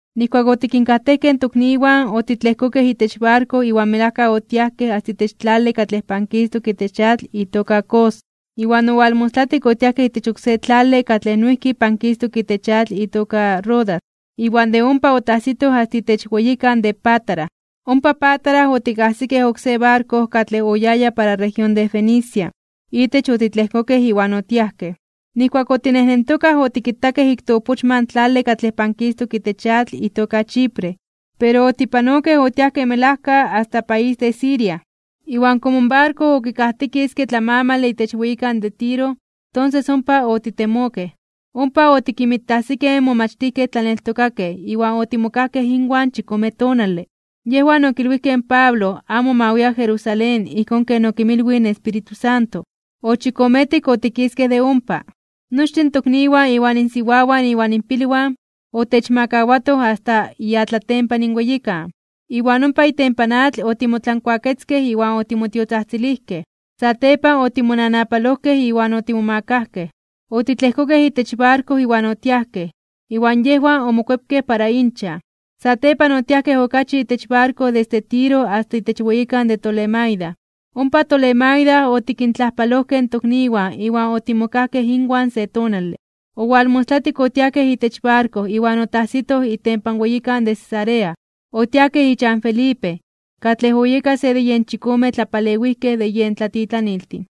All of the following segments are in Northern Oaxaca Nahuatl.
Nijkuak otikinkajtejkej in tokniwan, otitlejkokej itech barko iwan melajka otiajkej asta itech tlale katlej pankistok itech atl itoka Cos, iwan owalmostlatik otiajkej itech oksé tlale katlej noijki pankistok itech atl itoka Rodas, iwan de ompa otajsitoj asta itech weyikan de Pátara. Ompa Pátara otikajsikej oksé barko katlej oyaya para región de Fenicia, itech otitlejkokej iwan otiajkej. Nijkuak otinejnentokaj otikitakej ik toopochma in tlale katlej pankistok itech atl itoka Chipre, pero otipanokej otiajkej melajka asta país de Siria. Iwan komo in barko okikajtikiske tlamamale itech weyikan de Tiro, tonses ompa otitemokej. Ompa otikinmitajsikej in momachtijkej tlaneltokakej iwan otimokajkej inwan chikome tonale. Yejwan okilwijkej in Pablo amo ma wia Jerusalén ijkón ken okinmilwij in Espíritu Santo. Ochikometik otikiskej de ompa. Nochtin in tokniwan iwan insiwawan iwan inpilwan, otechmakawatoj asta iatlatempan in weyikan, iwan ompa itempan atl otimotlankuaketzkej iwan otimotiotzajtzilijkej. Satepan otimonanapalojkej iwan otimomakajkej. Otitlejkokej itech barko iwan otiajkej, iwan yejwan omokuepkej para inchan. Satepan otiajkej okachi itech barko desde Tiro asta itech weyikan de Tolemaida. Ompa Tolemaida otikintlajpalojkej in tokniwan iwan otimokajkej inwan se tonale. Owalmostlatik otiajkej itech barko iwan otajsitoj itempan weyikan de Cesarea. Otiajkej ichan Felipe, katlej oyeka se de yen chikome tlapalewijkej de yen tlatitlaniltin.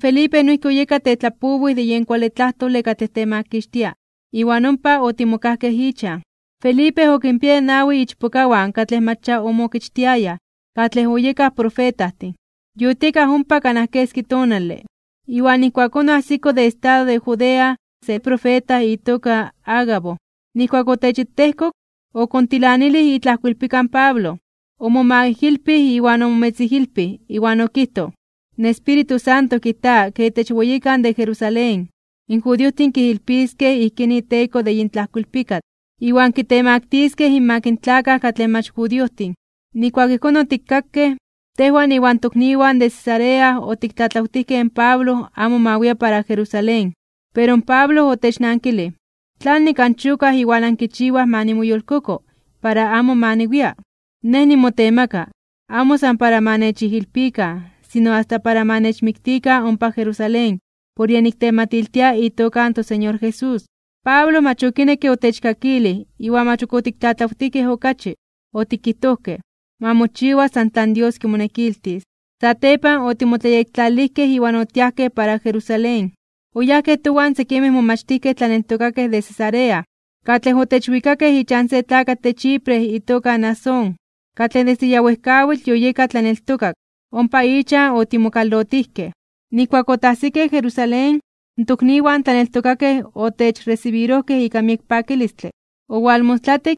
Felipe noijki oyeka tetlapowij de yen kuale tlajtole katlej temakixtia. Iwan ompa otimokajkej ichan. Felipe okinpiaya nawi ichpokawan katlej mach ya omookichtiayaj, katlej oyekaj profetajtin. Yotiekaj ompa kanaj keski tonale, iwan ijkuakón oajsiko de estado de Judea se profeta itoka Agabo. Nijkuak otechitejkok, okontilanilij itlajkoilpika in Pablo, omomaijilpij iwan omometzijilpij, iwan okijtoj: ―In Espíritu Santo kijta ke itech weyikan de Jerusalén, in judiojtin kijilpiskej ijkín iteko de yin tlajkoilpikatl, iwan kitemaktiskej (kitemaktiliskej) inmak in tlakaj katlej mach judiojtin. Nijkuak ijkón otikkakej, tejwan iwan tokniwan de Cesarea otiktlatlawtijkej in Pablo amo ma wia para Jerusalén. Pero in Pablo otechnankilij: ―¿Tlanik anchokaj iwan ankichiwaj ma nimoyolkoko para amo ma niwia? Nej nimotemaka, amo san para ma nechijilpikan, sino asta para ma nechmiktikan ompa Jerusalén por yen niktematiltia itoka in toSeñor Jesús. Pablo mach okinekke otechkakilij iwan mach ok otiktlatlawtijkej okachi, otikijtojkej: ―Ma mochiwa san tlan Dios kimonekiltis. Satepan, otimotlayektlalilijkej iwan otiajkej para Jerusalén. Oyajkej towan sekimej momachtijkej tlaneltokakej de Cesarea, katlej otechwikakej ichan se tlakatl de Chipre itoka Mnasón, katlej desde ya wejkawitl yoyeka tlaneltokak. Ompa ichan otimokalotijkej. Nijkuak otajsikej Jerusalén, in tokniwan tlaneltokakej otechresibirojkej ika miek pakilistle. Owalmostlatik,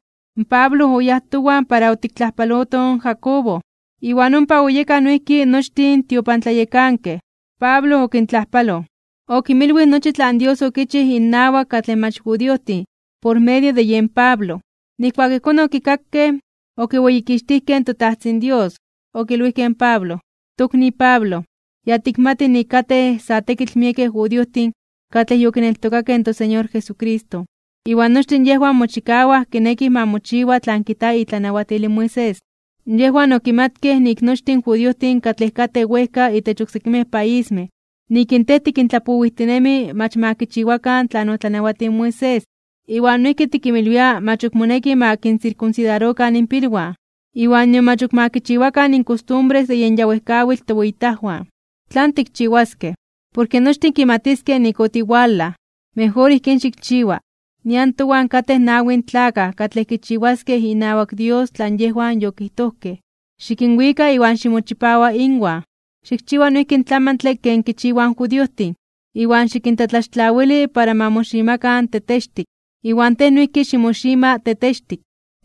Pablo oyáj towan para otiktlajpalotoj in Jacobo, iwan ompa oyekaj noijki nochtin in tiopantlayekankej. Pablo okintlajpaloj. Okinmilwij nochi tlan Dios okichij innawak katlej mach judiojtin por medio de yen Pablo. Nijkuak ijkón okikakej, okiweyikixtijkej in toTajtzin Dios. Okilwijkej in Pablo: ―Tokni Pablo, ya tikmati nik katej sa tekitl miekej judiojtin katlej yokineltokakej in toSeñor Jesucristo, iwan nochtin yejwan mochikawaj kinekij ma mochiwa tlan kijta itlanawatil in Moisés. Yejwan okimatkej nik nochtin in judiojtin katlej katej wejka itech oksekimej paismej, nik in tej tikintlapowijtinemi mach ma kichiwakan tlan otlanawatij in Moisés, iwan noijki tikinmilwia mach ok moneki ma kinsirkunsidarokan inpilwan, iwan nion mach ok ma kichiwakan in kostumbres de yen ya wejkawitl toweyitajwan. ¿Tlan tikchiwaskej? Porke nochtin kimatiskej nik otiwalaj. Mejor ijkín xikchiwa: Nian towan katej nawi tlakaj katlej kichiwaskej inawak Dios tlan yejwan yokijtojkej. Xikinwika, iwan ximochipawa inwan, xikchiwa noijki in tlamantle ken kichiwaj in judiojtin. Iwan xikintlatlaxtlawili para ma moximakan tetextik (kuameloj), iwan tej noijki ximoxima tetextik.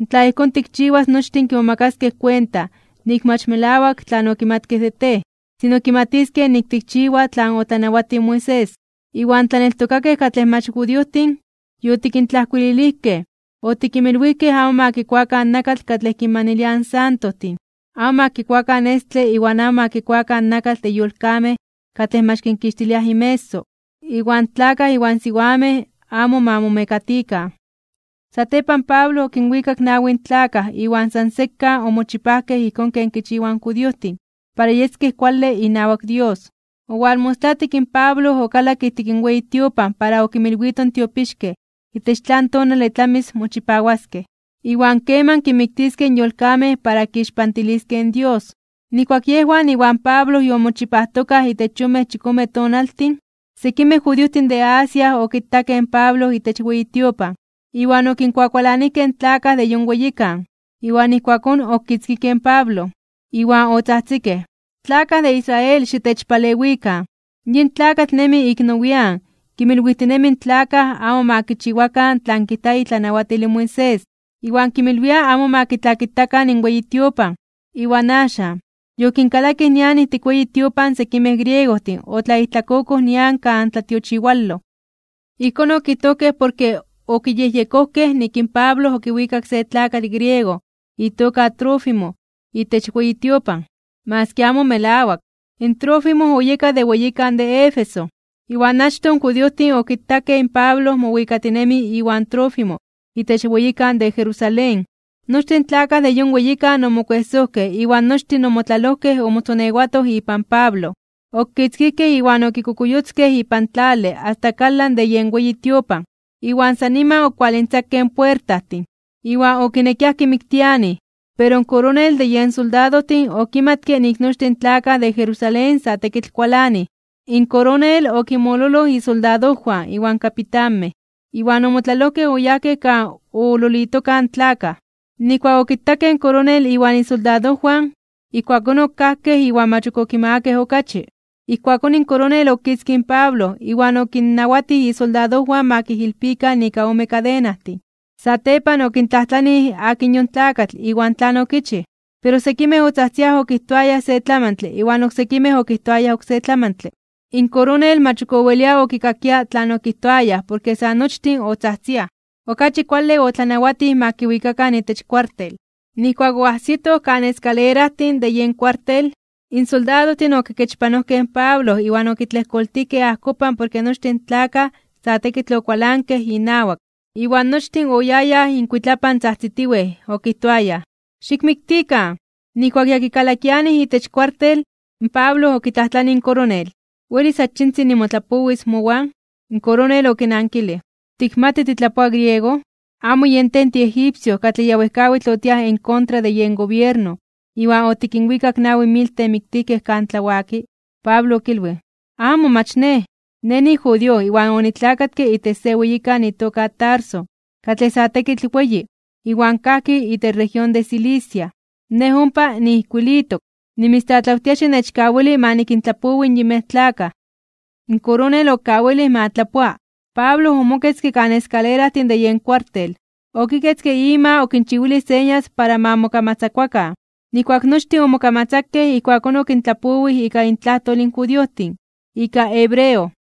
Tla ijkón tikchiwas nochtin kimomakaskej kuenta nik mach melawak tlan okimatkej de tej, sino kimatiskej nik tikchiwa tlan otlanawatij in Moisés. Iwan in tlaneltokakej katlej mach judiojtin, yotikintlajkuililijkej, otikinmilwijkej amo ma kikuakan nakatl katlej kinmaniliaj in santojtin, amo ma kikuakan estle iwan amo ma kikuakan nakatl de yolkamej katlej mach kinkixtiliaj inmeso, iwan in tlakaj iwan siwamej amo ma momekatikan. Satepan Pablo okinwikak in nawin tlakaj iwan san sekan omochipajkej ijkón ken kichiwaj in judiojtin para yeskej kuale inawak Dios. Owalmostlatik in Pablo okalakke ijtik in weyi tiopan para okinmilwito in tiopixkej itech tlan tonale tlamis mochipawaskej, iwan keman kinmiktiskej in yolkamej para kixpantiliskej in Dios. Nijkuak yejwan iwan Pablo yomochipajtokaj itech yonmej chikome tonaltin, sekimej judiojtin de Asia okitakej in Pablo itech weyi tiopan, iwan okinkuakualanijkej in tlakaj de yon weyikan. Iwan ijkuakón okitzkijkej in Pablo. Iwan otzajtzikej: ―¡Tlakaj de Israel, xitechpalewikan! Yin tlakatl nemi ik nowian (nian nepa) kinmilwijtinemi in tlakaj amo ma kichiwakan tlan kijta itlanawatil in Moisés, iwan kinmilwia amo ma kitlakitakan in weyi tiopan. Iwan axan, yokinkalakij nian ijtik in weyi tiopan sekimej griegojtin otlaijtlakokoj nian kan tlatiochiwaloj. Ijkón okijtojkej porke okiyejyekojkej nik in Pablo okiwikak se tlakatl griego itoka Trófimo itech weyi tiopan, maski amo melawak. In Trófimo oyeka de weyikan de Éfeso, iwan achtoj in judiojtin okitakej in Pablo mowikatinemi iwan Trófimo itech weyikan de Jerusalén. Nochtin tlakaj de yon weyikan omokuejsojkej iwan nochtin omotlalojkej omotzonewatoj ipan Pablo. Okitzkijkej iwan okokuyotzkej ipan tlale asta kalan de yen weyi tiopan, iwan san niman okualintzakej in puertajtin. Iwan okinekiaj kimiktianij, pero in koronel de yen soldadojtin okimatke nik nochtin in tlakaj de Jerusalén sa tekitl kualanij. In koronel okinmololoj isoldadojwan iwan kapitanmej, iwan omotlalojkej oyajkej kan ololitokaj in tlakaj. Nijkuak okitakej in koronel iwan isoldadojwan, ijkuakón okajkej iwan mach ok okimagakej okachi. Ijkuakón in koronel okitzkij in Pablo iwan okinnawatij isoldadojwan ma kijilpikan ika ome kadenajtin. Satepan okintlajtlanij akin yon tlakatl iwan tlan okichij. Pero sekimej otzajtziaj okijtoayaj se tlamantle iwan oksekimej okijtoayaj oksé tlamantle. In koronel mach owelia okikakia tlan okijtoayaj porke sa nochtin otzajtziaj. Okachi kuale otlanawatij ma kiwikakan itech kuartel. Nijkuak oajsitoj kan eskalerajtin (escalones) de yen kuartel, in soldadojtin okikechpanojkej in Pablo iwan okitlejkoltijkej ajkopan porke nochtin in tlakaj sa tekitl okualankej inawak. Iwan nochtin oyayaj inkuitlapan tzajtzitiwej okijtoayaj: ―¡Xikmiktikan! Nijkuak ya kikalakianij itech kuartel, in Pablo okitlajtlanij in koronel: ―¿Welis achitzin nimotlapowis mowan? In koronel okinankilij: ―¿Tikmati titlapoa griego? ¿Amo yen tej tiegipcio katlej ya wejkawitl otiaj en kontra de yen gobierno iwan otikinwikak nawi mil temiktijkej kan tlawaki? Pablo okilwij: ―¡Amo, mach nej! Nej nijudío iwan onitlakatke itech se weyikan itoka Tarso, katlej sa tekitl weyi, iwan kajki itech región de Cilicia. Nej ompa niijkuilitok. Nimitztlatlawtia xinechkawili ma nikintlapowi in yinmej tlakaj. In koronel okawilij ma tlapoa. Pablo omoketzke kan eskalerajtin de yen kuartel, okiketzke ima okinchiwilij señas para ma mokamatzakuakan. Nijkuak nochtin omokamatzakej ijkuakón okintlapowij ika intlajtol in judiojtin, ika hebreo: